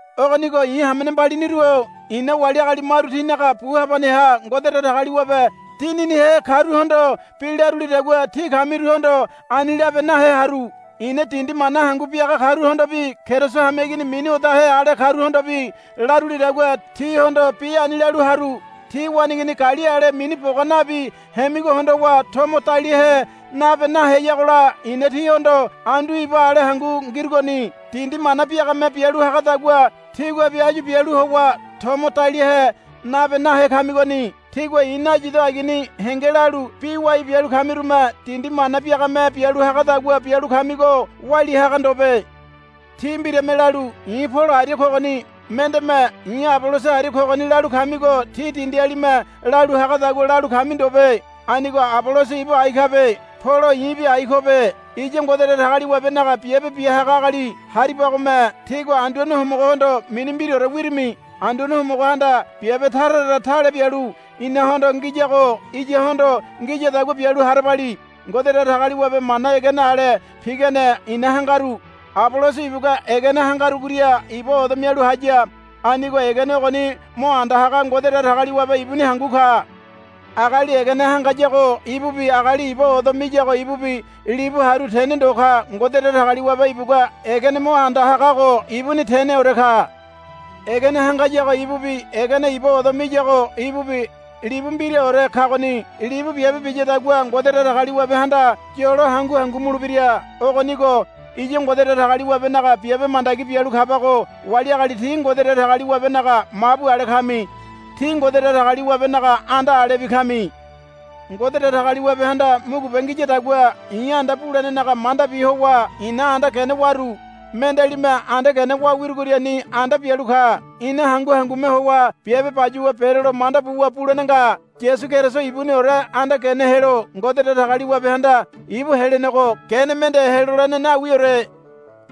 Ogonigo i̱ hamene mbaliniru-o i̱na wali agali maru tinaga bu habaneha Ngode Datagaliwabe Dininihe karuhondo bi larulidagua tí kamiruhondo ani labe nahe haru. I̱na dindi mana hangu biaga karuhondobi Keriso hameigini mini odahe ale karuhondobi larulidagua tíhondo bi ani lalu haru. Tí waneigini gali ale mini boga nabi hemigo hondowa tomo daliahe nabe naheyagola i̱na tíhondo andu iba ale hangu ngirugoni. Dindi mana biagame bialu hagadagua tíguabi áyu bialu howa tomo daliahe nabe nahe kamigoni. Tígua i̱ nayido agini henge lalu bi wai bialu kamirume dindi mana biagame bialu hagadagua bialu kamigo walia haga ndobe. Tí mbirame lalu, I̱ Polo aria kogoni, mendeme, I̱ Aboloso aria kogoni, lalu kamigo tí dindialime lalu hagadagua lalu kami ndobe. Anigo Aboloso ibu ai kabe. Polo i̱bi ai kobe. Iya Ngode Datagaliwabenaga biabe bia haga agali haribagome tígua Anduane Homogohondo mini mbiraore wirimi. Anduane Homogohanda biabe tara tara tale bialu inahondo ngiyago iyahondo ngiyadagua bialu harabali. Ngode Datagaliwabe mana egene ale pigane i̱na hangaru. Aboloso ibugua egene hangarugoria iba odo mialu haya. Anigo egene ogoni mo anda haga Ngode Datagaliwabe ibuni hangu ka. Agali egene hangayago ibubi agali iba odo miyago ibubi libu haru tene ndo ka. Ngode Datagaliwabe ibugua egene mo anda hagago ibuni teneore ka. Egene hangayago ibubi egeneni iba odo miyago ibubi libu mbiraore kagoni. Libu biabe biyadagua Ngode Datagaliwabehanda yolo hangu hangu mulebira. Ogonigo iya Ngode Datagaliwabenaga biabe mandagi bialu kabago wali agali tí Ngode Datagaliwabenaga mabu ale kami. Tí Ngode Datagaliwabenaga anda alebi kami. Ngode Datagaliwabehanda mugube ngiyadagua i̱ anda bulenenaga mandabi howa ina anda gene waru. Mendealime anda gene wa wirugoriani anda bialu ka. Ina hangu hangume howa biabe bayuwa berolo manda buwa bulene nga. Yasu Keriso ibuniore anda gene helo Ngode Datagaliwabehanda ibu helenego gene mende helolene nawiore.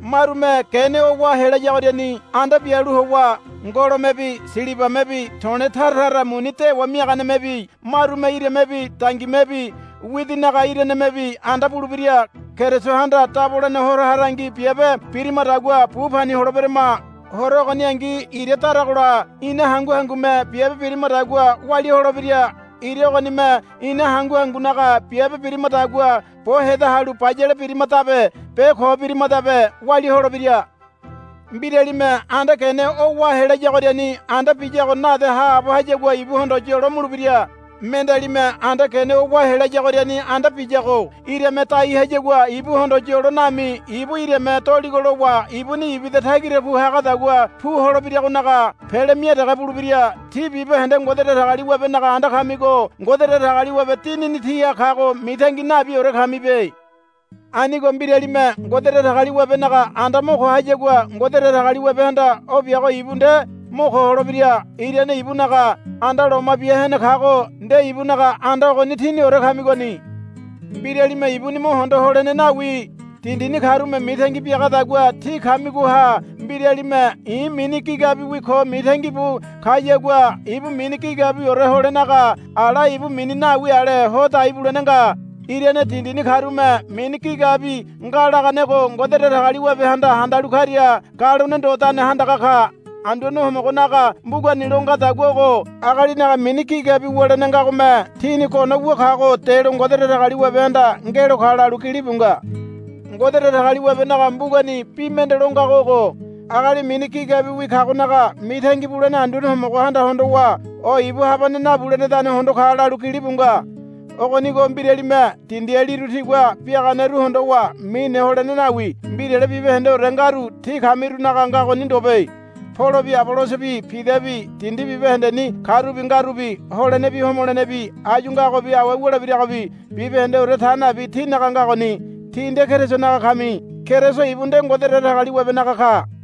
Marume gene o wa helayagoriani anda bialu howa ngolomebi silibamebi to̱le̱ tara tara muni dewa miaganemebi marume iramebi dangimebi widinaga iranemebi anda bulebira. Kerisohanda dabolene Horo harangi biabe birimadagua bu pani holeberama. Horo ogoningi ira daragola ina hangu hangume biabe birimadagua walia holebira. Ira ogonime ina hangu hangunaga biabe birimadagua bo heda halu bayale birimadabe be ko birimadabe walia holebira. Mbiralime anda gene o wa helayagoriani anda biyago nade haabo hayagua ibuhondo yolo mulebira. Mendealime anda gene o wa helayagoriani anda biyago irame dai hayagua ibuhondo yolo nami ibu irame doligo lowa ibuni ibida tagira pu hagadagua pu holebiragonaga pele mia dege bulebira. Tí bibahende Ngode Datagaliwabenaga anda kamigo Ngode Datagaliwabe Dinini tíha kago mitangi nabiore kamibe. Anigo mbiralime Ngode Datagaliwabenaga anda mo ko hayagua Ngode Datagaliwabehanda o biago ibu nde mo ko holebira. Irane ibunaga anda loma bia hene kago nde ibunaga anda ogoni tíniore kamigoni. Mbiralime ibuni mo hondo holene nawi. Dindini karume mitangi biagadagua tí kamigoha mbiralime, I̱ mini gigabiwi ko, mitangi bu kayagua ibu mini gigabiwiore holenaga ala ibu mini nawi ale ho dai bulene nga. Irane dindini karume mini gigabi nga laganego Ngode Datagaliwabehanda handalu karia galone ndodane handaga ka. Anduane Homogonaga mbugani lo ngadagua ogo, Agalinaga mini gigabi wulene ngagome tini gono wu kago delo Ngode Datagaliwabehanda ngelo ka, lalu gilibu nga. Ngode Datagaliwabenaga mbugani bi mende lo ngago ogo, Agali mini gigabiwi kagonaga mitangi bulene Anduane Homogohanda hondowa o ibu habane nabulenedane hondo ka, lalu gilibu nga. Ogonigo mbiralime dindialiru tigua biaganeru hondowa mine holene nawi. Mbirale bibahendeore ngaru tí kamirunaga ngagoni ndobe. Polobi Abolosobi Pidabi dindi bibahendeni karubi ngarubi holenebi homolenebi áyu ngagobi awe wulebiragobi bibahendeore ta nabi tínaga ngagoni. Tí nde Kerisonaga kami. Keriso ibu nde Ngode Datagaliwabenaga ka.